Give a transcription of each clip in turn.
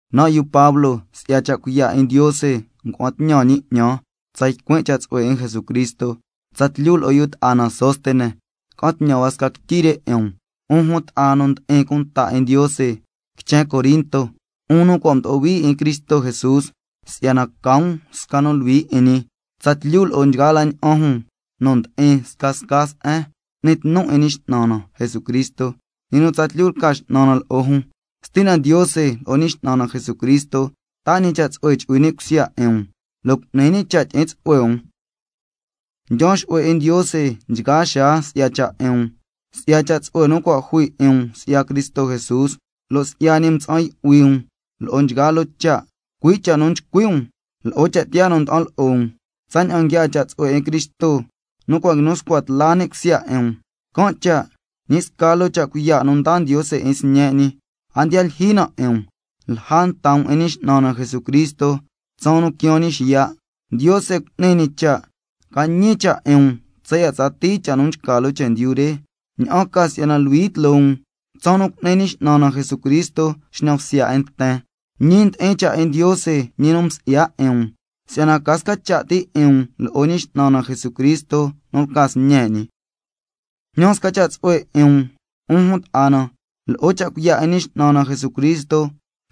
Nan' yu Pablo, si'ya cha' cuiya' 'in Ndiose ngua'an tñan ñi 'ñan tsa ycuin' cha' tsu'hue 'in Jesucristo. Tsatlyu lo'o yu ta'a na Sóstenes ca'an tñan hua sca quityi re 'in um, 'un jun ta'a na nu ndi'in cunta 'in Ndiose quichen Corinto, 'un nu cua' mdo'o hui 'in Cristo Jesús si'yana ca um sca nu luhui 'in ñi tsatlyu lo'o nchgaa la ña'an jun nu ndi'in scasca se'en n'ni tnu 'in Ñi X'nan na Jesucristo, ñi nu tsatlyu lca X'nan na lo'o jun. Stina Ndiose lo'o Ñi X'nan na Jesucristo taa ñi cha' tsu'hue chu'hui ni' cusya 'in um, lo' cu'ni ñi cha' tyi'in tsu'hue um. Ndyaan xu'hue 'in Ndiose nchgaa xaa si'ya cha' 'in um, si'ya cha' tsu'hue nu cua' mdaa ñi 'in um si'ya Cristo Jesús, lo' si'ya ñi mtsa'an yu'hui um lo'o nchgaa loo cha', cui' cha' nu nchcui' um lo'o cha' tiyaa nu nda'an lo'o um, tsaña'an nguiaa cha' tsu'hue 'in Cristo nu cua' nguinu scua tla ni' cusya 'in um, can' cha' ñi sca loo cha' cuiya' nu ndaa Ndiose 'in sñe' ñi, a ndiya lyijyi na 'in um, tsalja nta um 'in Ñi X'nan na Jesucristo tsaan nu quiaan ñi xiya'. Ndiose cu'ni ñi cha' ca ñi cha' 'in um tsaya' tsatii cha' nu nchca loo chendyu re, ña'an ca si'yana luhui tloo um tsaan nu cu'ni Ñi X'nan na Jesucristo xñan bsya 'in nten. Ñi ndi'in cha' 'in Ndiose, ñi nu msi'ya 'in um si'yana ca sca cha' ti 'in um lo'o Ñi X'nan na Jesucristo nu lca Sñe' ñi. Jñan sca cha' tsu'hue 'in um, 'un jun ta'a na, lo'o cha' cuiya' 'in Ñi X'nan na Jesucristo,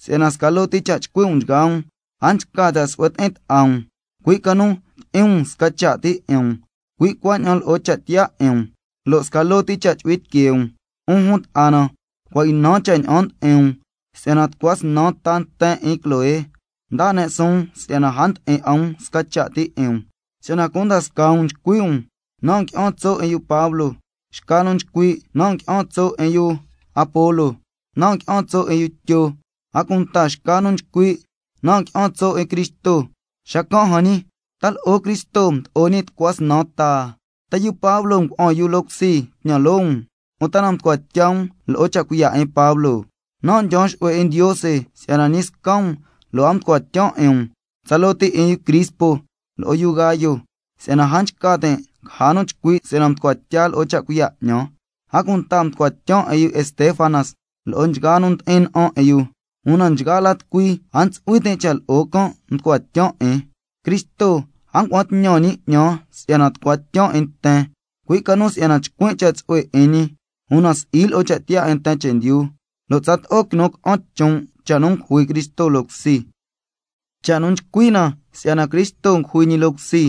si'yana sca loo ti cha' chcui' um nchgaa um, a nchca cha' su'hue ti'in ta'a um, cui' ca nu tyi'in um sca cha' ti 'in um, cui' cuaña'an lo'o cha' tiyaa 'in um, lo' sca loo ti cha' chu'hui tiquee um. 'Un jun ta'a na, cua' ynan cha' ña'an ndi'in um, si'yana tucua snan nten 'in yu Cloé ndaa ne' suun si'yana a ndi'in 'a um sca cha' ti 'in um. Si'yana cunda scaa um nchcui' um: Nan' ngui'an tso' 'in yu Pablo. Xca nu nchcui': Nan' ngui'an tso' 'in yu Apolo. Nan' ngui'an tso' 'in yu Tyo. A cunta xca nu nchcui': Nan' ngui'an tso' 'in Cristo. Xacan' jan ñi: ¿Ta lo'o Cristo mdo'o ñi tucua snan ta? ¿Ta yu Pablo ngua'an yu loo cusi tñan loo um? ¿Uta na mducua tya um lo'o cha' cuiya' 'in Pablo? Nan' ndyaan xu'hue 'in Ndiose si'yana ñi sca um lo' a mducua tyan 'in um, tsaloo ti 'in yu Crispo lo'o yu Gayo, si'yana a nchca tin' caja nu chcui' si'yana mducua tya lo'o cha' cuiya' 'ñan. A cunta mducua tyan 'in yu Estéfanas lo'o nchgaa nu ndi'in na'an 'in yu, una nchgaa la tucui a ntsu'hui tin' cha' lo'o can' mducua tyan 'in. Cristo a ngua'an tñan ñi 'ñan si'yana tucua tyan 'in nten, cui' ca nu si'yana chcuin' cha' tsu'hue 'in ñi, una si'i lo'o cha' tiyaa 'in nten chendyu, lo' tsato'o quinu ca'an chon' cha' nu ngujui Cristo loo cusi. Cha' nu nchcui' na si'yana Cristo ngujui ñi loo cusi,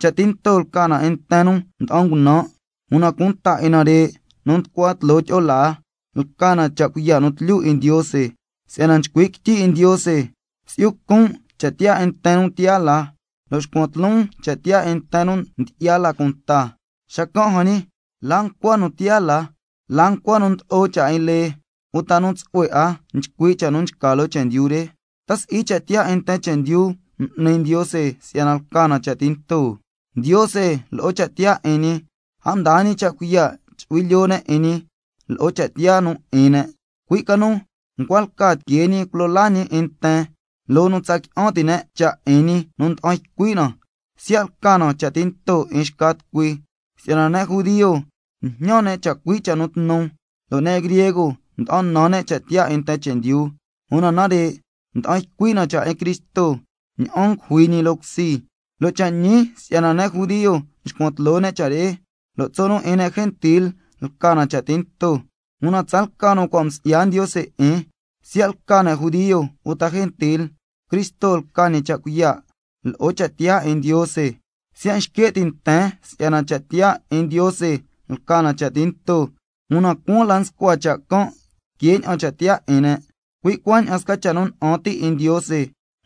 cha' tinto lca na 'in nten nu nda'an ngunan', una cunta 'in nare' nu nducua tloo tyi'o laa, lca na cha' cuiya' nu tlyu 'in Ndiose. Si'yana nchcui' quityi 'in Ndiose: —Si'yu con' cha' tiyaa 'in nten nu tiyaa la, lo' xcuan tloon cha' tiyaa 'in nten nu ndyi'ya la cunta—. Xacan' jan ñi, ¿la ncua nu tiyaa la? ¿La ncua nu ndlo'o cha' 'in lee, uta nu tsu'hue 'a nchcui' cha' nu nchca loo chendyu re? ¿Ta si'i cha' tiyaa 'in nten chendyu m'ni Ndiose si'yana lca na cha' tinto? Ndiose lo'o cha' tiyaa 'in ñi, a mdaa ñi cha' cuiya' chu'hui lyoo ne' 'in ñi lo'o cha' tiyaa nu 'in ne', cui' ca nu ncua lca tiquee ñi culo laa ñi 'in nten loo nu tsa qui'an ti' ne' cha' 'in ñi nu nda'an ycui' na, siya' lca na cha' tinto 'in xca tucui. Si'yana ne' judio njñan ne' chacui' cha' nu tnu, lo' ne' griego nda'an nan ne' cha' tiyaa 'in nten chendyu, una nare' nda'an ycui' na cha' 'in Cristo ña'an ngujui ñi loo cusi, lo' cha' ñi si'yana ne' judio nxcuan tloo ne' cha' re, lo' tso' nu 'in ne' gentil lca na cha' tinto, una tsalca nu cua' msi'ya Ndiose 'in, siya' lca ne' judio uta gentil, Cristo lca ñi cha' cuiya' lo'o cha' tiyaa 'in Ndiose. Siya' nxque' ti' nten si'yana cha' tiyaa 'in Ndiose lca na cha' tinto, una cuaan la nscua cha' can' que ña'an cha' tiyaa 'in ne', cui' cuaña'an sca cha' nu na'an ti' 'in Ndiose,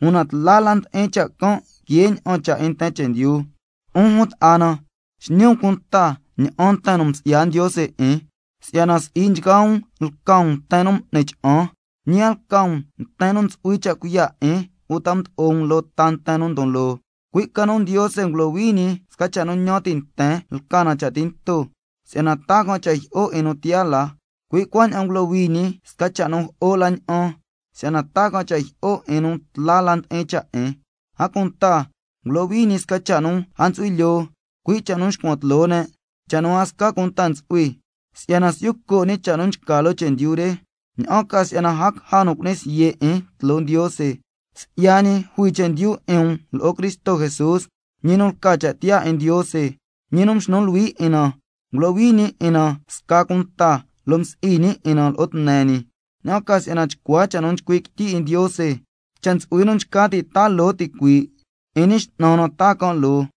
una tla la ndi'in cha' can' que ña'an cha' 'in nten chendyu. 'Un jun ta'a na, xñi um cunta ña'an nten nu msi'ya Ndiose 'in, si'yana si'i nchgaa um lca um nten nu m'ni cha'an, ñi a lca um nten nu ntsu'hui cha' cuiya' 'in uta mdo'o um loo ta nten nu ndon loo, cui' ca nu Ndiose ngulohui ñi sca cha' nu ñan ti' nten lca na cha' tinto, si'yana taa can' cha' jyi'o 'in nu tiyaa la, cui' cuaña'an ngulohui ñi sca cha' nu jo'o la ña'an, si'yana taa can' cha' jyi'o 'in nu tla la ndi'in cha' 'in, a cunta ngulohui ñi sca cha' nu a ntsu'hui lyoo, cui' cha' nu nxcuan tloo ne', cha' nu a sca cunta ntsu'hui, si'yana si'yu co' ñi cha' nu nchca loo chendyu re, ña'an ca si'yana a caja nu cu'ni siye' 'in tloo Ndiose. Si'ya ñi jui chendyu 'in um lo'o Cristo Jesús, ñi nu lca cha' tiyaa 'in Ndiose, ñi nu mxnu luhui 'in na, ngulohui ñi 'in na sca cunta, lo' msi'i ñi 'in na lo'o tne ñi, ña'an ca si'yana tsato'o cha' nu nchcui' quityi 'in Ndiose: —Cha' ntsu'hui nu nchca ti' taa loo ticuii', 'in Ñi X'nan na taa can' loo—.